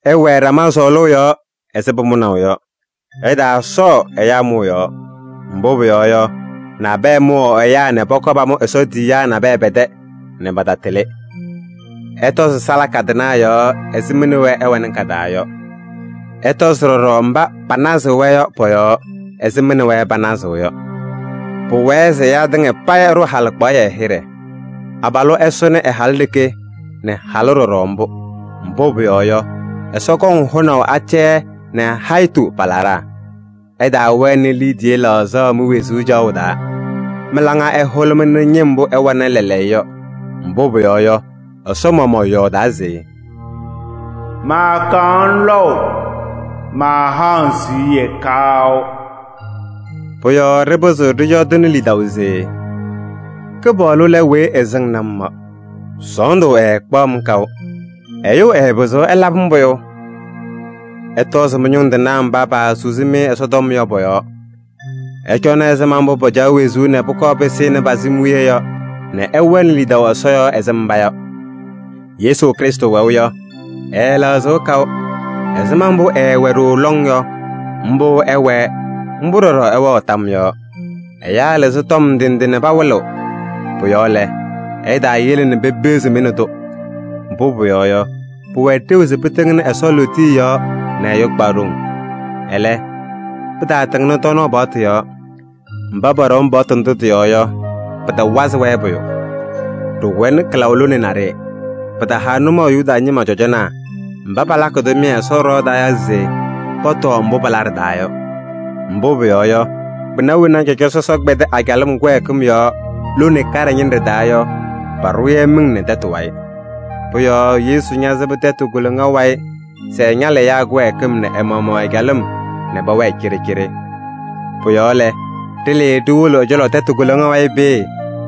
Ɩwɛɛ ɖama sɔɔlʋʋ yɔɔ ɛzɩ pʋmʋnaʋ yɔ. Ɩtaasɔɔ ɛyaa mʋʋ yɔɔ. Mbʋ pʋyɔɔ yɔ, nabɛyɛ mʋwaɣ ɛyaa nɛ pɔkɔɔ pamʋ Ɛsɔ tiyiyaa nabɛyɛ pɛ-tɛ nɛ patatɩlɩ. Ɩtɔzɩ salaka tɩnaa yɔɔ ɛzɩ mɩ nɛ wɛ ɩwɛnɩ ka-taa yɔ. Ɩtɔzɩ ɖɔɖɔ mba panazɩɣ-wɛ yɔ pɔ-yɔɔ ɛzɩ mɩ nɛ wɛ panazɩɣ yɔ. Pʋwɛɛ se ɛyaa tɩŋa payɩ ɛɖʋ halɩkpaɣyɛ hɩɖɛ. Abalʋ ɛsʋnɩ ɛ-halʋ ɖeke nɛ halʋ ɖɔɖɔ mbʋ. Mbʋ pʋyɔɔ yɔ, Ɛsɔ kɔŋ hʋnaʋ acɛyɛ nɛ hayitu pa-laɖaa. Ɩtaawɛnɩ liidiye laɣzaɣ mi-wezuu caɣʋ taa. Mɩ-laŋa ɛhʋlʋmɩnɩ ñɩm mbʋ ɩwɛnɩ lɛɛlɛɛyɔ yɔ, mbʋ pʋyɔɔ yɔ, Ɛsɔ maɣmaɣ yɔɔdaa se: “Maakaɣ-ŋ lɔʋ, maahaɣ-ŋ siɣye kaʋ.” Pʋ-yɔɔ ɖɩpɩzɩɣ ɖɩyɔɔdɩnɩ lidaʋ se: “Kɩpaɣlʋ lɛ weyi ɛsɩŋnɩ-m yɔ. Sɔɔndʋ ɛɛkpaɣ-m kaʋ. Ɛyʋ ɛɛpɩzɩɣ ɛlabɩ-m pʋyʋ!” Ɩtɔzɩ mɩ-ñʋŋ tɩnaa mba paasusi-mɩ Ɛsɔtɔm yɔ pɔ-yɔɔ. Ɩcɔnɩ ɛzɩma mbʋ pacaɣ wezuu nɛ pʋkɔɔ pɩsɩnɩ pa-sɩm wiye yɔ nɛ ɩwɛnɩ lidaʋ Ɛsɔ yɔɔ ɛzɩ mba yɔ. Yesu Krɩstʋ wɛʋ yɔ, ɛɛlɛɣzɩɣ kaʋ. Ɛzɩma mbʋ ɛɛwɛ ɖooo lɔŋ yɔ, mbʋ ɛwɛɛ, mbʋ ɖɔɖɔ ɛwɛɣ tam yɔɔ. Ɛyaa lɩzɩ tɔm ndɩ ndɩ nɛ pawɩlɩɣ. Pʋ-yɔɔ lɛ, ɩtaayele nɛ pepeɣzi-mɩ nɛ tʋ. Mbʋ pʋyɔɔ yɔ, pʋwɛ ɖeu se pɩtɩŋnɩ Ɛsɔ lootiye yɔɔ nɛ ɛyʋ kpa ɖoŋ. Ɛlɛ, pɩtaatɩŋnɩ tɔɔnaɣ paɣtʋ yɔɔ. Mba pɔɖɔm paɣtʋ ndʋ tɩ-yɔɔ yɔ, pɩtawazɩ-wɛ pʋyʋ. Ɖɩwɛnɩ kɩlaʋ lone naɖɩyɛ. Pɩtaha nʋmɔʋ Yuda ñɩma cɔjɔnaa mba palakɩ tʋmɩyɛ Ɛsɔ ɖɩɣa taa yɔ se pɔtɔɔ mbʋ pala ɖɩ-taa yɔ. Mbʋ pʋyɔɔ yɔ, kpɩna wena cɔjɔ sɔsɔ kpɛdɩ a-calɩm kɩwɛɛkɩm yɔɔ lone kaɖɛ ñɩnɖɛ taa yɔ, paɖʋʋ-yɛ miŋ nɛ tɛtʋ wayɩ. Pʋ-yɔɔ Yesu ñasɩbɩ tɛtʋ koloŋa wayɩ se ɛñalɩ ɛyaa kɩwɛɛkɩm nɛ ɛ-maɣmaɣ ɛ-calɩm nɛ pɛwɛɛ cɩɖɩcɩɖɩ. Pʋ-yɔɔ lɛ, ɖɩlɩɩ ɖiwolo ɛ-cɔlɔ tɛtʋ koloŋa wayɩ peeye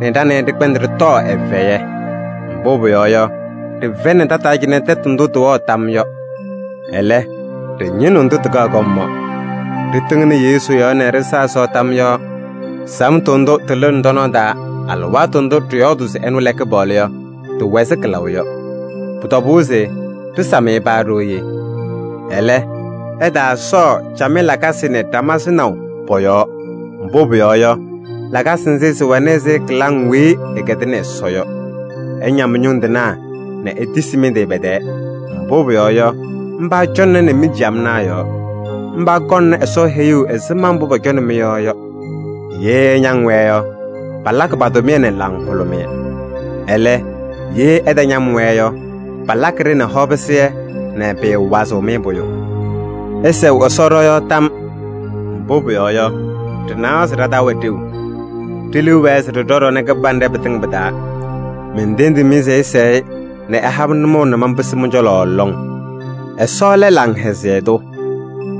nɛ ɖa nɛ ɩ ɖɩkpɛndɩ ɖɩtɔɔ ɛ-fɛyɛ. Mbʋ pʋyɔɔ yɔ, ɖɩfɛyɩnɩ tataa cɩnɛ tɛtʋ ndʋ tɩwɛɣ tam yɔ. Ɛlɛ, ɖɩñɩnɩɣ ndʋ tɩkaɣ kɔm yɔ. Ɖɩtɩŋnɩ Yesu yɔɔ nɛ ɖɩsa Ɛsɔ tam yɔɔ. Samtʋ ndʋ tɩlɩɣnɩ ɖɔ-nɔɔ taa alɩwaatʋ ndʋ ɖɩyɔɔdʋʋ se ɛnʋ lɛ Kɩpaɣlʋ yɔ, tɩwɛ ɛzɩ kɩlaʋ yɔ. Pʋ-tɔbʋʋ se ɖɩsam-ɩ paa ɖooye. Ɛlɛ, ɩtaasɔɔ camɩyɛ lakasɩ nɛ ɖama sɩnaʋ pɔ-yɔɔ. Mbʋ pʋyɔɔ yɔ, lakasɩ nzɩ sɩwɛnɩ ɛzɩ kɩlaŋ weyi ɩkɛdɩnɩ Ɛsɔ yɔ. Ɩña mɩ-ñʋŋ tɩnaa nɛ itisi mɩ-tɩ pɛ-tɛɛ. Mbʋ pʋyɔɔ yɔ, mba cɔŋnɩnɩ mi-ciyamnaa yɔɔ. Mba kɔŋnɩ Ɛsɔ heyuu ɛzɩma mbʋ pɔcɔnɩ mɩ-yɔɔ yɔ. Ye ɩñaŋ-wɛ yɔ, palakɩ pa-tʋmɩyɛ nɛ laŋhʋlʋmɩyɛ. Ɛlɛ, ye ɩtañam-wɛ yɔ, palakɩ-ɖɩ nɛ hɔpɩsɩyɛ nɛ pɩɩwazɩɣ-mɩ pʋyʋ. Ɩsɛɣ Ɛsɔ ɖɔ-yɔɔ tam. Mbʋ pʋyɔɔ yɔ, ɖɩnawa se ɖa-taa wɛ ɖeu. Ɖe-liu wɛɛ se ɖɩɖɔ ɖɔnɛ kɩbanɖɛ pɩtɩŋa pɩ-taa. Mentendiɣ-mɩ se ɩsɛɛ-ɩ nɛ ɛha-m nʋmɔʋ nɛ manpɩsɩ mɩ-cɔlɔ lɔŋ. Ɛsɔ lɛ laŋhɛzɩyɛ tʋ.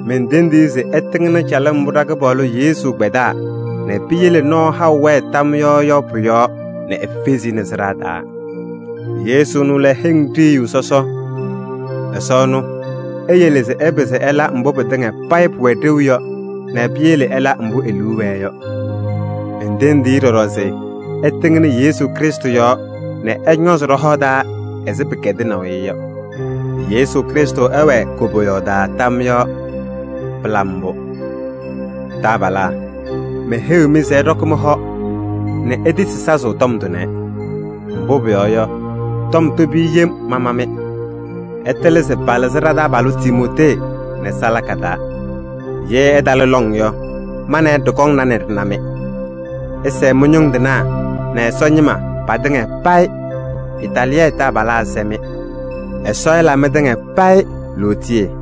Mentendiɣ-i se ɛtɩŋnɩ calɩm mbʋ ɖa-Kɩpaɣlʋ Yesu kpɛdaa nɛ piyele nɔɔ haʋ wɛɛ tam yɔɔ yɔ pʋ-yɔɔ nɛ efezi-i nɛ sɩɖaa taa. Yesu ɛnʋ lɛ heŋ ɖiyiyu sɔsɔ. Ɛsɔ ɛnʋ, eyele se ɩpɩzɩ ɩla mbʋ pɩtɩŋa payɩ pʋwɛ ɖeu yɔ nɛ piyele ɩla mbʋ e-liu wɛɛ yɔ. Mentendiɣ-i ɖɔɖɔ se ɛtɩŋnɩ Yesu Krɩstʋ yɔɔ nɛ ɛñɔɔzɩ ɖɔ-hɔ taa ɛzɩ pɩkɛdɩnaʋ-ɩ yɔ. Yesu Krɩstʋ ɛwɛɛ koboyaɣ taa tam yɔɔ! Pɩla mbʋ! Taabalaa, meheyiɣ-mɩ se ɩɖɔkɩ mɩ-hɔ nɛ itisi sazʋʋ tɔm tʋnɛ. Mbʋ pʋyɔɔ yɔ, tɔm tobi yem mama-mɩ. Ɩtɩlɩ se palɩzɩ ɖa-taabalʋ Timootee nɛ salaka taa. Ye ɛtalɩ lɔŋ yɔ, ma nɛ ɩ ɖɩkɔŋna nɛ ɖɩna-mɩ. Ɩsɛɛ mɩ-ñʋŋ tɩnaa nɛ Ɛsɔ ñɩma patɩŋa payɩ. Itaaliyɛɛ taabalaa sɛ-mɩ. Ɛsɔ ɛla mɩtɩŋa payɩ lootiye!